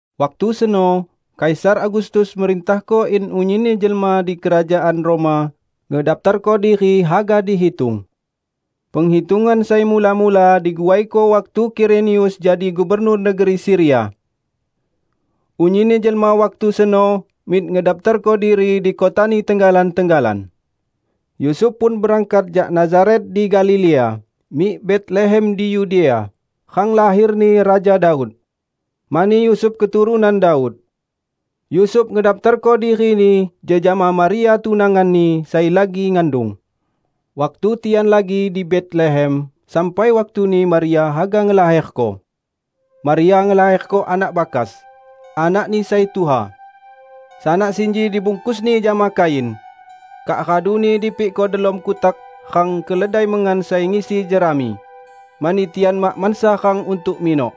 Waktu seno Kaisar Agustus merintahko in unyinni jelma di Kerajaan Roma mendaptarko diri haga dihitung. Penghitungan sai mula-mula diguaiko waktu Kirenius jadi gubernur negeri Siria. Unyinni jelma waktu seno mik ngedaptarko diri di kotani tenggalan-tenggalan. Yusuf pun berangkat jak Nazaret di Galilea, mik Betlehem di Yudea, rang laherni Raja Daud; mani Yusuf keturunan Daud. Yusuf ngedaptarko dirini jejama Maria tunanganni, sai lagi ngandung. Waktu tian lagi di Betlehem sampai waktuni Maria haga ngelaherko. Maria ngelaherko anak bakas, anakni sai tuha. Sanak sinji dibungkusni jama kain, kak raduni dipikko delom kutak rang keledai mengan sai ngisi jerami; mani tian mak mansa rang untuk minok.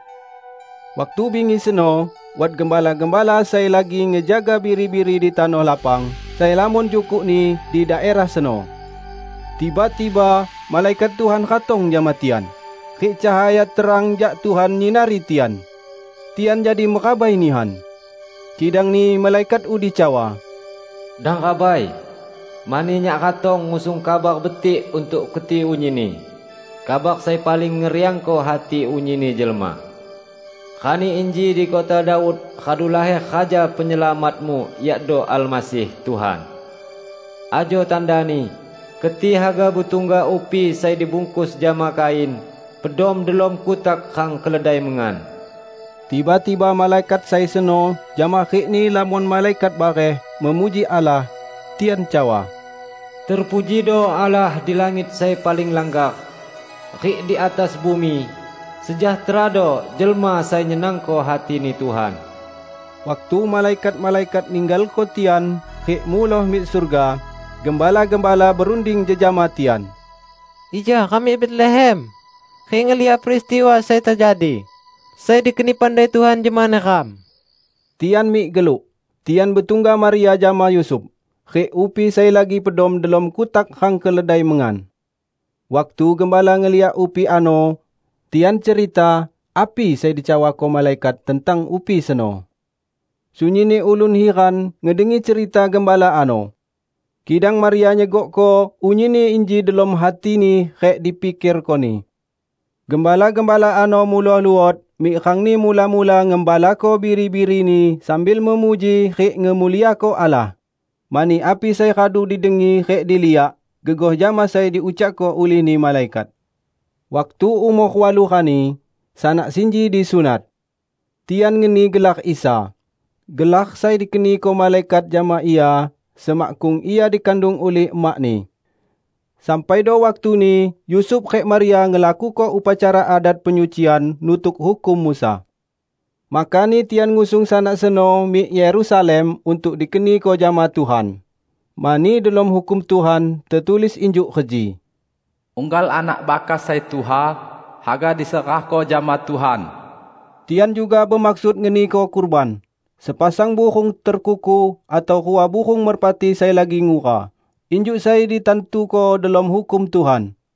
Waktu bingi seno wat gembala-gembala sai lagi ngejaga biri-biri di tanoh lapang sai lamon jukukni di daerah seno. Tiba-tiba malaikat Tuhan ratong jama tian, rik cahaya terang jak Tuhan nyinari tian, tian jadi merabai nihan. Kidangni malaikat udi cawa, "Dang rabai! Mani nyak ratong ngusung kabar betik untuk keti unyinni -- kabar sai paling ngeriangko hati unyinni jelma. Rani inji di kota Daud radu laher Raja Penyelamatmu yakdo Almasih, Tuhan. Ajo tandani: Keti haga betungga upi sai dibungkus jama kain, pedom delom kutak rang keledai mengan." Tiba-tiba malaikat sai seno jama rikni lamon malaikat bareh memuji Allah. Tian cawa, "Terpujido Allah di langit sai paling langgar! Rik di atas bumi, sejahterado jelma sai nyenangko hatini Tuhan!" Waktu malaikat-malaikat ninggalko tian rik muloh mik surga, gembala-gembala berunding jejama tian, "Ija ram mik Betlehem rik ngeliak peristiwa sai tejadi, sai dikeni pandai Tuhan jama neram." Tian mik geluk, tian betungga Maria jama Yusuf, rik upi sai lagi pedom delom kutak rang keledai mengan. Waktu gembala ngeliak upi ano, tian cerita api sai dicawako malaikat tentang upi seno. Sunyinni ulun hiran ngedengi cerita gembala ano. Kidang Maria nyegokko unyinni inji delom hatini rik dipikerkoni. Gembala-gembala ano muloh luot mik rangni mula-mula ngembalako biri-birini sambil memuji rik ngemuliako Allah, mani api sai radu didengi rik diliak, gegoh jama sai diucakko ulihni malaikat. Waktu umor walu rani, sanak sinji disunat. Tian ngeni gelar Isa, gelar sai dikeniko malaikat jama Ia semakkung Ia dikandung ulih emak-Ni. Sampaido waktuni Yusuf rik Maria ngelakuko upacara adat penyucian nutuk hukum Musa. Makani tian ngusung Sanak seno mik Yerusalem untuk dikeniko jama Tuhan. Mani delom Hukum Tuhan tetulis injuk reji, "Unggal anak bakas sai tuha, haga diserahko jama Tuhan." Tian juga bemaksud ngeniko kurban, sepasang burung terkuku atau rua burung merpati sai lagi ngura, injuk sai ditantuko delom Hukum Tuhan.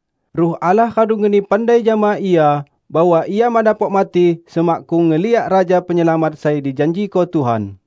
Ruh Allah radu ngeni pandai jama ia bahwa ia mak dapok mati semakkung ngeliak Raja Penyelamat sai dijanjiko Tuhan.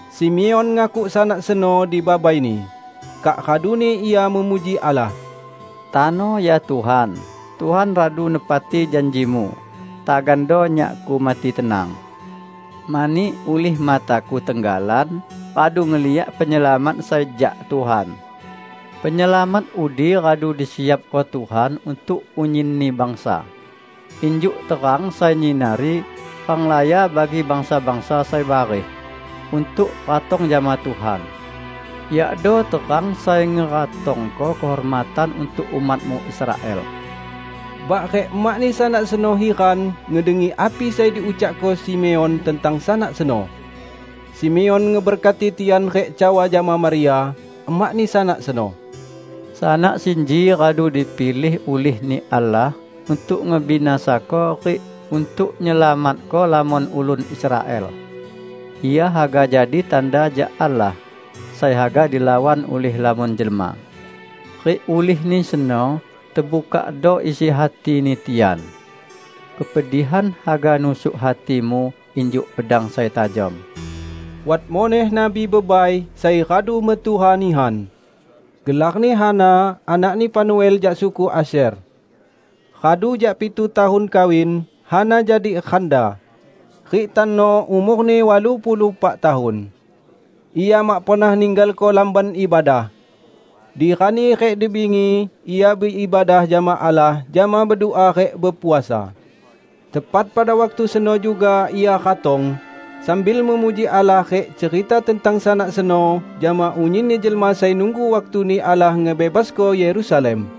Simeon ngakuk Sanak seno dibabai-Ni, kak raduni ia memuji Allah, "Tano, ya Tuhan, Tuhan radu nepati janji-Mu. Tagando nyakku mati tenang. Mani, ulih mataku tenggalan radu ngeliak Penyelamat sai jak Tuhan. Penyelamat udi radu disiapko Tuhan untuk unyinni bangsa: injuk terang sai nyinari renglaya bagi bangsa-bangsa sai bareh, untuk ratong jama Tuhan; yakdo terang sai ngeratongko kehormatan untuk umat-Mu Israel." Bak rik emak-Ni Sanak seno hiran ngedengi api sai diucakko Simeon tentang Sanak seno. Simeon ngeberkati tian rik cawa jama Maria, emakni Sanak seno, "Sanak sinji radu dipilih ulih-Ni Allah untuk ngebinasako rik untuk nyelamatko lamon ulun Israel. Ia haga jadi tanda jak Allah, sai haga dilawan ulih lamon jelma, rik ulihni seno tebukakdo isi hatini tian. Kepedihan haga nusuk hatimu injuk pedang sai tajom." Wat muneh nabi bebai sai radu metuha nihan. Gelarni Hana, anakni Fanuel, jak suku Asyer. Radu jak pitu tahun kawin, Hana jadi randa, rik tano umorni walu puluh pak tahun. Ia mak pernah ninggalko Lamban Ibadah. Di rani rik di bingi ia beibadah jama Allah jama bedua rik bepuasa. Tepat pada waktu seno juga ia ratong, sambil memuji Allah rik cerita tentang Sanak seno jama unyinni jelma sai nunggu waktuni Allah ngebebasko Yerusalem.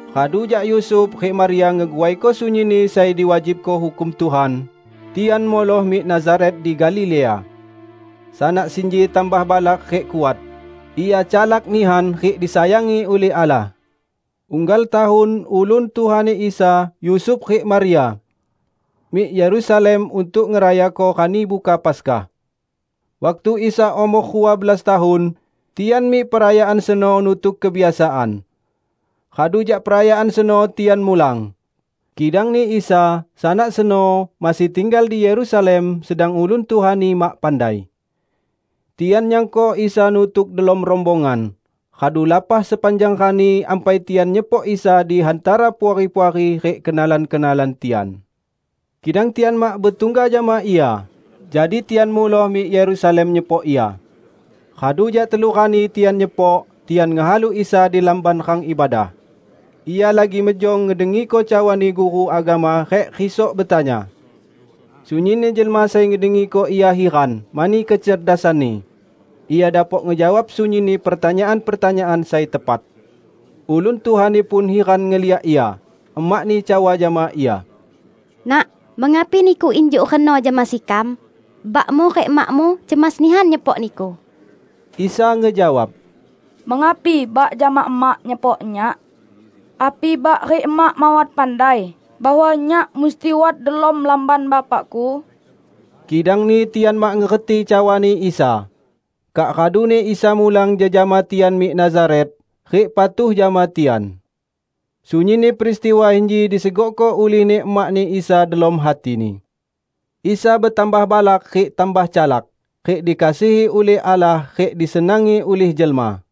Radu jak Yusuf rik Maria ngeguaiko sunyinni sai diwajibko Hukum Tuhan, tian muloh mik Nazaret di Galilea. Sanak sinji tambah balak rik kuat. Ia calak nihan rik disayangi ulih Allah. Unggal tahun ulun tuhani Isa Yusuf rik Maria, mik Yerusalem untuk ngerayako Rani Buka Paskah. Waktu Isa umor rua belas tahun, tian mik perayaan seno nutuk kebiasaan. Radu jak perayaan seno tian mulang, kidangni Isa, Sanak seno, masih tinggal di Yerusalem sedang ulun tuha-Ni mak pandai. Tian nyangko Isa nutuk delom rombongan. Radu lapah sepanjang rani ampai tian nyepok Isa di hantara puari-puari rik kenalan-kenalan tian. Kidang tian mak betungga jama Ia, jadi tian muloh mik Yerusalem nyepok Ia. Radu jak telu rani, tian nyepok tian ngehalu Isa di Lamban rang ibadah. Ia lagi mejong ngedengiko cawani guru agama rik risok betanya. Sunyinni jelma sai ngedengiko Ia hiran mani kecerdasan-Ni. Ia dapok ngejawab sunyinni pertanyaan-pertanyaan sai tepat. Ulun tuha-Ni pun hiran ngeliak Ia. Emak-Ni cawa jama Ia, "Nak, mengapi Niku injuk reno jama sekam? Bak-Mu rik emak-Mu cemas nihan nyepok Niku!" Isa ngejawab, "Mengapi bak jama emak nyepok Nyak? Api bak rik emak mawat pandai bahwa Nyak musti wat delom Lamban Bapa-Ku?" Kidangni tian mak ngerti cawani Isa. Kak raduni Isa mulang jejama tian mik Nazaret, rik patuh jama tian. Sunyinni peristiwa inji disegokko ulihni emakni Isa delom hatini. Isa betambah balak rik tambah calak, rik dikasihi ulih Allah rik disenangi ulih jelma.